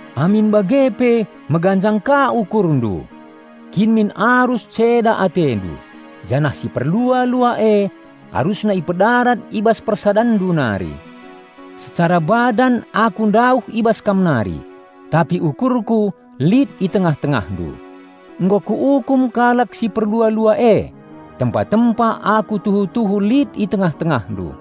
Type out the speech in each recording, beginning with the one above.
Amin bage pe meganjang ka ukurndu! Kin min arus ceda atendu, janah si perlua-lua e arusna ipedarat i bas persadanndu nari. Secara badan aku ndauh i bas kam nari, tapi ukurku lit i tengah-tengahndu. Nggo kuukum kalak si perlua-lua e, tempa-tempa aku tuhu-tuhu lit i tengah-tengahndu.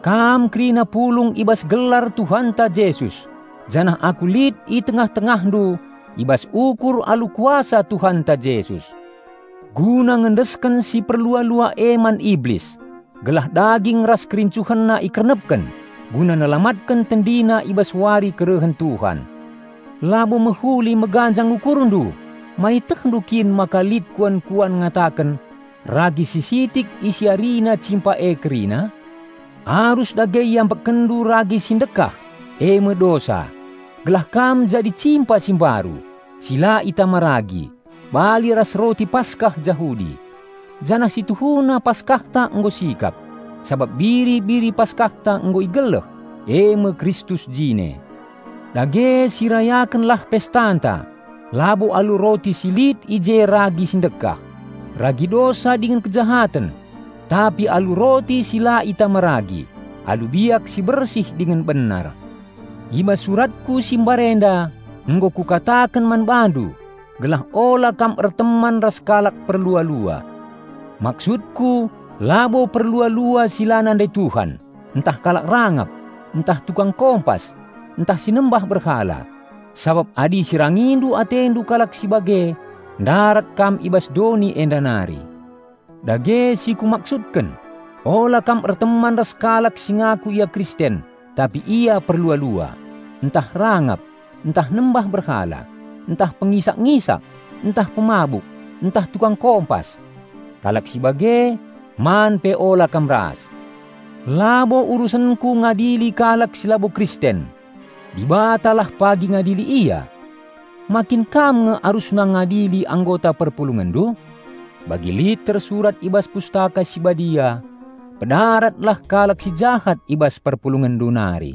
Kam kerina pulung i bas gelar Tuhanta Jesus, janah aku lit i tengah-tengahndu i bas ukur alu kuasa Tuhanta Jesus, guna ngendesken si perlua-lua e man Iblis, gelah daging ras kerincuhenna ikernepken, guna nelamatken tendina i bas wari kerehen Tuhan. Labo mehuli meganjang ukurndu! Ma ietehndu kin maka lit kuan-kuan ngataken, "Ragi si sitik isiarina cimpa e kerina?" Arus dage iambekkenndu ragi si ndekah, eme dosa, gelah kam jadi cimpa si mbaru, si la itama ragi, bali ras roti Paskah Jahudi. Janah si tuhuna Paskahta nggo sikap, sabap biri-biri Paskahta nggo igeleh, eme Kristus jine. Dage sirayakenlah pestanta, labo alu roti si lit i je ragi si ndekah -- ragi dosa dingen kejahaten -- tapi alu roti si la itama ragi, alu biak si bersih dingen benar. I bas suratku si mbarenda nggo kukataken man bandu gelah ula kam erteman ras kalak perlua-lua. Maksudku labo perlua-lua si la nandai Tuhan, ntah kalak rangap, ntah tukang kompas, ntah si nembah berhala, sabap adi isirangindu atendu kalak si bage, ndarat kam i bas doni enda nari. Dage si kumaksudken, ula kam erteman ras kalak si ngaku ia Kristen tapi ia perlua-lua, ntah rangap, ntah nembah berhala, ntah pengisak-ngisak, ntah pemabuk, ntah tukang kompas. Kalak si bage, man pe ula kam ras. Labo urusenku ngadili kalak si labo Kristen. Dibatalah pagi ngadili ia. Ma kin kam nge arusna ngadili anggota perpulungenndu? Bagi lit tersurat i bas Pustaka Si Badia, "Pedaratlah kalak si jahat i bas perpulungenndu nari."